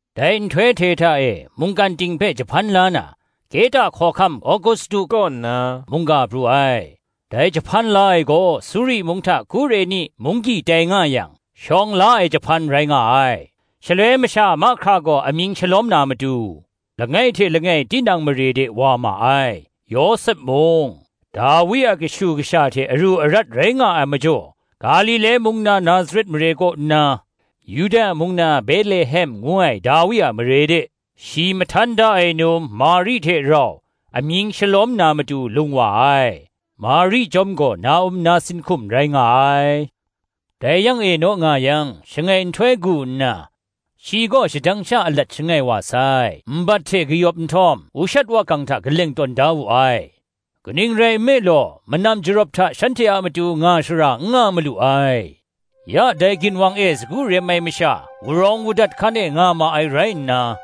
Dai nhtoi hte hta e, mungkan ting hpe jahpan la na, Kehta hkawhkam Agustu kaw nna mungga pru ai. Dai jahpan la ai gaw, Suri mung hta Kureni munggyi tai nga yang, shawng la ai jahpan rai nga ai. Shaloi masha mahkra gaw amying shalawm na matu, langai hte langai tinang mare de wa ma ai. Yawsep mung, Dawi a kashu kasha hte aru arat rai nga ai majaw, Galile mung na Nazaret mare kaw nna, Yuda mung na Betlehem ngu ai Dawi a mare de, shi mahtan da ai num Mari hte rau amying shalawm na matu lung wa ai: Mari chyawm gaw na-um nasin hkum rai nga ai. Dai yang e naw nga yang, shangai nhtoi gu nna, shi gaw shadang sha alat shangai wa sai: nbat hte kayawp nhtawm, ushat wakang hta kaleng tawn da wu ai; kaning rai nme law, manam jarawp hta shanhte a matu nga shara n nga malu ai. Ya dai ginwang e sagu rem ai masha, urawng udat hkan e nga ma ai rai nna,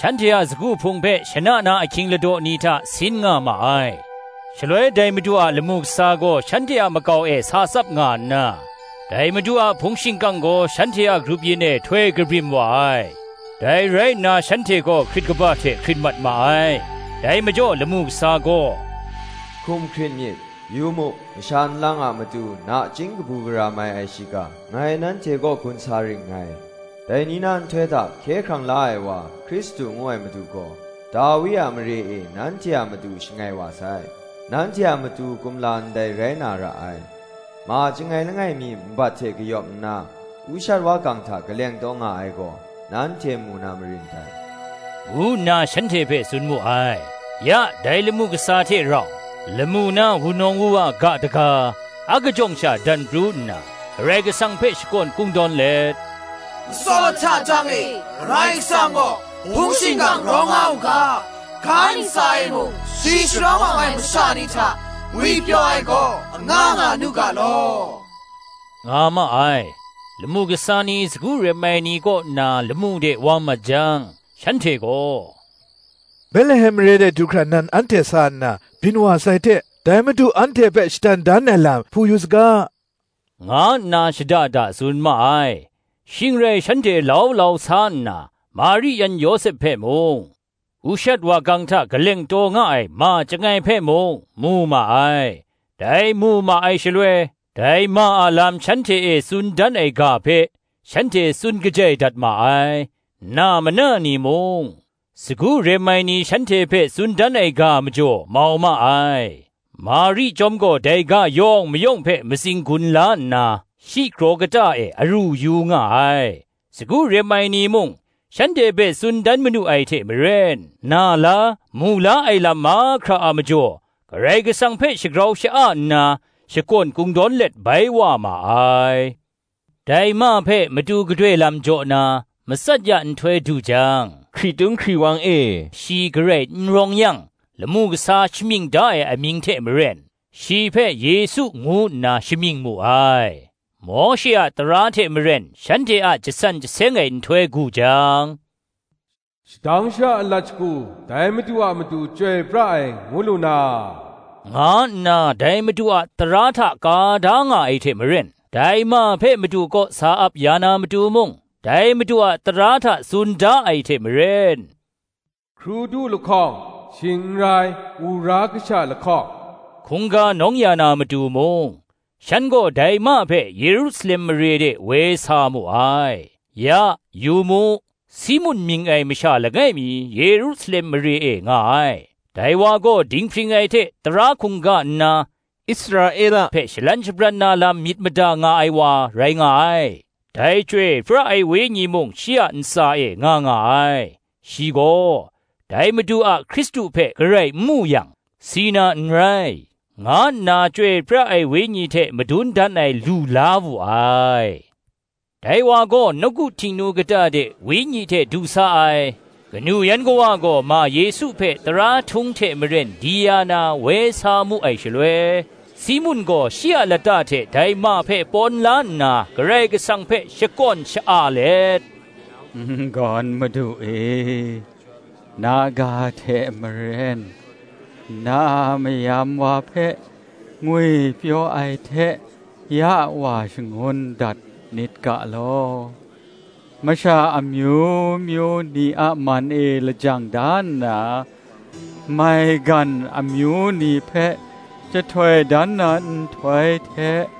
shanhte a sagu hpung hpe shana na ahkying ladaw ni hta sin nga ma ai. Shaloi dai Madu a lamu kasa gaw shanhte a makau e sa tsap nga nna, dai Madu a hpung shingkang gaw shanhte a grup yin e htoi kabrim wa ai: dai rai nna shanhte gaw hkrit kaba hte hkrit mat ma ai. Dai majaw lamu kasa gaw, “Hkum hkrit myit; yu mu, masha nlang a matu nachying kabu gara mai ai shiga, ngai nanhte kaw gun sa ring ngai; dai ni na nhtoi hta Hkye hkrang la ai wa Hkristu ngu ai Madu gaw, Dawi a mare e nanhte a matu shangai wa sai: nanhte a matu kumla ndai rai na ra ai: ma chyangai langai mi nbat hte kayawp nna ushat wakang hta kaleng taw nga ai gaw, nanhte mu na marin dai,” ngu nna shanhte hpe tsun mu ai Ya, dai lamu kasa hte rau, lamu na wunawng wuwa ga daga, akajawng sha dan pru nna, Karai Kasang hpe shakawn kungdawn let, “Matsaw lahta tang e Karai Kasang gaw hpung shingkang rawng nga u ga; Ga ntsa e mung, shi sharawng awng ai masha ni hta, ngwipyaw ai gaw anga nga nu ga law,” nga ma ai. Lamu kasa ni sagu rem ai ni kaw nna lamu de wa mat jang, shanhte gaw, “Betlehem mare du hkra nan anhte sa nna, byin wa sai hte, dai Madu anhte hpe shadan dan ai lam hpu yu saga,” nga nna shada da tsun ma ai. Shing rai shanhte lau lau sa nna, Mari yan Yawsep hpe mung, ushat wakang hta kaleng taw nga ai ma chyangai hpe mung, mu ma ai. Dai mu ma ai shaloi, dai ma a lam shanhte e tsun dan ai ga hpe, shanhte tsun kajai dat ma ai. Na mana ni mung, sagu rem ai ni shanhte hpe tsun dan ai ga majaw mau ma ai. Mari chyawm gaw dai ga yawng mayawng hpe matsing gun la nna, shi kraw kata e a ru yu nga ai. Sagu rem ai ni mung, shanhte hpe tsun dan manu ai hte maren, na la, mu la ai lam mahkra a majaw, Karai Kasang hpe shagrau sha-a nna, shakawn kungdawn let bai wa ma ai. Dai ma hpe matu gadoi lam jaw na, matsat ya nhtoi du jang, hkritung hkriwang e shi garai n rawng yang, lamu kasa shamying da ai amying hte maren, shi hpe Yesu ngu nna shamying mu ai. Mawshe a tara hte maren shanhte a jasan jaseng ai nhtoi gu jang, “Shadang sha alat shagu dai Madu a matu chyoi pra ai ngu lu na,” nga nna, dai Madu a tara hta ka da nga ai hte maren, dai ma hpe Madu kaw sa ap ya na matu mung, dai Madu a tara hta tsun da ai hte maren, Hkrudu lahkawng, shing n rai, u ra kasha lahkawng, hkungga nawng ya na matu mung, shan gaw dai ma hpe Yerusalem mare de woi sa mu ai. Ya, yu mu, Simun mying ai masha langai mi Yerusalem mare e nga ai: dai wa gaw dinghpring ai hte tara hkungga nna, Israela hpe shalan shabran na lam myit mada nga ai wa rai nga ai; dai Chyoi pra ai Wenyi mung shi a ntsa e nga nga ai. Shi gaw, dai Madu a Hkristu hpe garai n mu yang, si na n rai, nga nna Chyoi pra ai Wenyi hte madun dan ai lu la wu ai. Dai wa gaw nawku Htingnu kata de Wenyi hte du sa ai; kanu yan kawa gaw ma Yesu hpe tara htung hte maren di ya na woi sa mu ai shaloi, Simun gaw shi a lata hte dai ma hpe pawn la nna Karai Kasang hpe shakawn sha-a let, “N-gawn Madu e, na ga hte maren, na a mayam wa hpe ngwipyaw ai hte ya wa shangun dat nit ga law: Masha amyu myu ni a man e lajang da nna, Maigan amyu ni hpe jahtoi dan na nhtoi hte,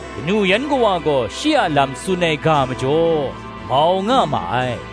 Kanu yan kawa gaw shi a lam tsun ai ga majaw, mau nga ma ai.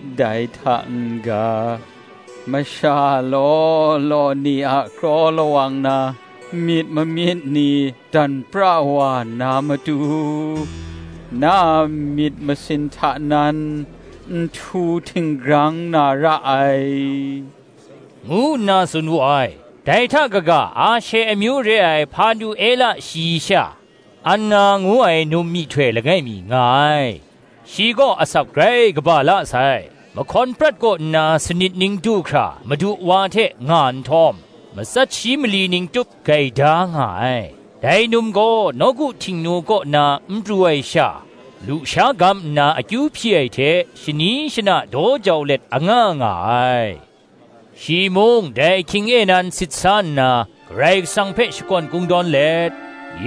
dai hta n ga, masha law law ni a kraw lawang na myit mamyit ni dan pra wa na matu, na a myit masin hta nan nhtu htinggrang na ra ai,” ngu nna tsun wu ai. Dai hta kaga, Ashe amyu re ai Hpanuela shayi sha, Anna ngu ai num myihtoi langai mi nga ai; shi gaw asak grai kaba la sai; mahkawn prat kaw nna sanit ning du hkra madu wa hte nga nhtawm, matsat shi mali ning tup gaida nga ai: dai num gaw nawku Htingnu kaw na n pru ai sha, lusha gam nna akyu hpyi ai hte shani shana daw jau let anga nga ai. Shi mung dai ahkying e nan sit sa nna, Karai Kasang hpe shakawn kungdawn let,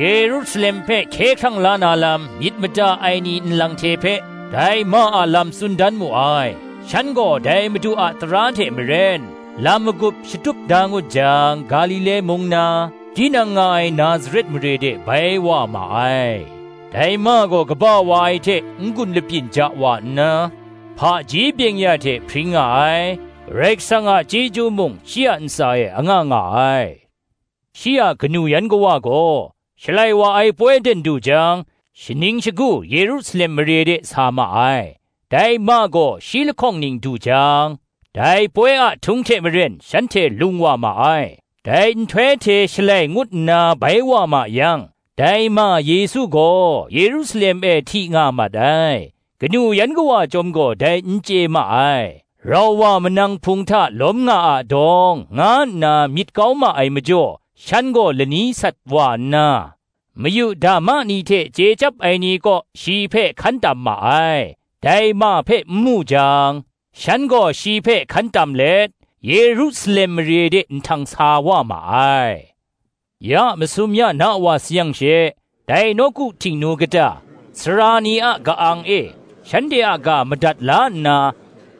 Yerusalem hpe hkye hkrang la na lam myit mada ai ni nlang hte hpe, dai ma a lam tsun dan mu ai. Shan gaw dai Madu a tara hte maren, lam magup shatup da ngut jang, Galile mung na, tinang nga ai Nazaret mare de bai wa ma ai. Dai ma gaw kaba wa ai hte n-gun lapyin ja wa nna, hpaji byeng-ya hte hpring nga ai; Karai Kasang a chyeju mung, shi a ntsa e anga nga ai. Shi a kanu yan kawa gaw, Shalai wa ai poi ten du jang, shaning shagu Yerusalem mare de sa ma ai. Dai ma gaw shi lahkawng ning du jang, dai poi a htung hte maren shanhte lung wa ma ai; dai nhtoi hte shalai ngut nna bai wa ma yang, dai ma Yesu gaw Yerusalem e hti nga mat ai; kanu yan kawa chyawm gaw dai n chye ma ai. Rau wa manang hpung hta lawm nga a dawng, nga nna myit kau ma ai majaw, shan gaw lani sat wa nna, mayu dama ni hte chye chyap ai ni kaw shi hpe hkan tam ma ai; dai ma hpe n mu jang, shan gaw shi hpe hkan tam let, Yerusalem mare de nhtang sa wa ma ai. Ya masum ya na wa sayang she, dai nawku Htingnu kata, sara ni a ka-ang e, shanhte a ga madat la nna,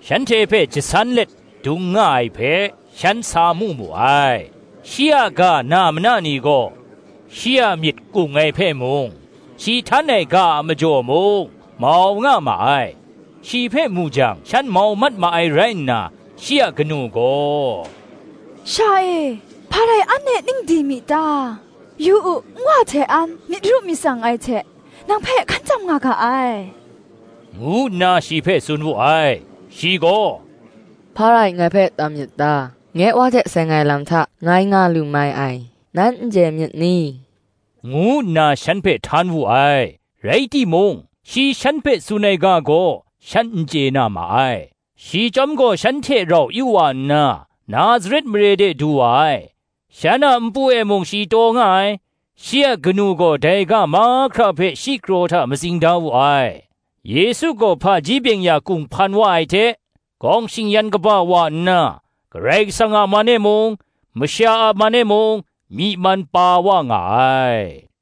shanhte hpe jasan let dung nga ai hpe, shan sa mu mu ai. Shi a ga na mana ni gaw, shi a myit kung ai hpe mung, shi htan ai ga a majaw mung, mau nga ma ai. Shi hpe mu jang shan mau mat ma ai rai nna, shi a kanu gaw, “Sha e, hpa rai an e ning di mi ta? yu u, nwa hte an myit ru myit tsang ai hte nang hpe hkan tam nga ga ai,” ngu nna shi hpe tsun wu ai. Shi gaw, “Hpa rai ngai hpe tam myit ta? Nye Wa hte seng ai lam hta ngai nga lu mai ai, nan n chye myit ni?” ngu nna shan hpe htan wu ai. Rai timung, shi shan hpe tsun ai ga gaw, shan n chye na ma ai. Shi chyawm gaw shan hte rau yu wa nna, Nazaret mare de du wa ai: shan a npu e mung shi taw nga ai: shi a kanu gaw dai ga mahkra hpe shi kraw hta matsing da wu ai. Yesu gaw hpaji byeng-ya kunghpan wa ai hte, gawng shing-yan kaba wa nna, Karai Kasang a man e mung, masha a man e mung, myi man pa wa nga ai.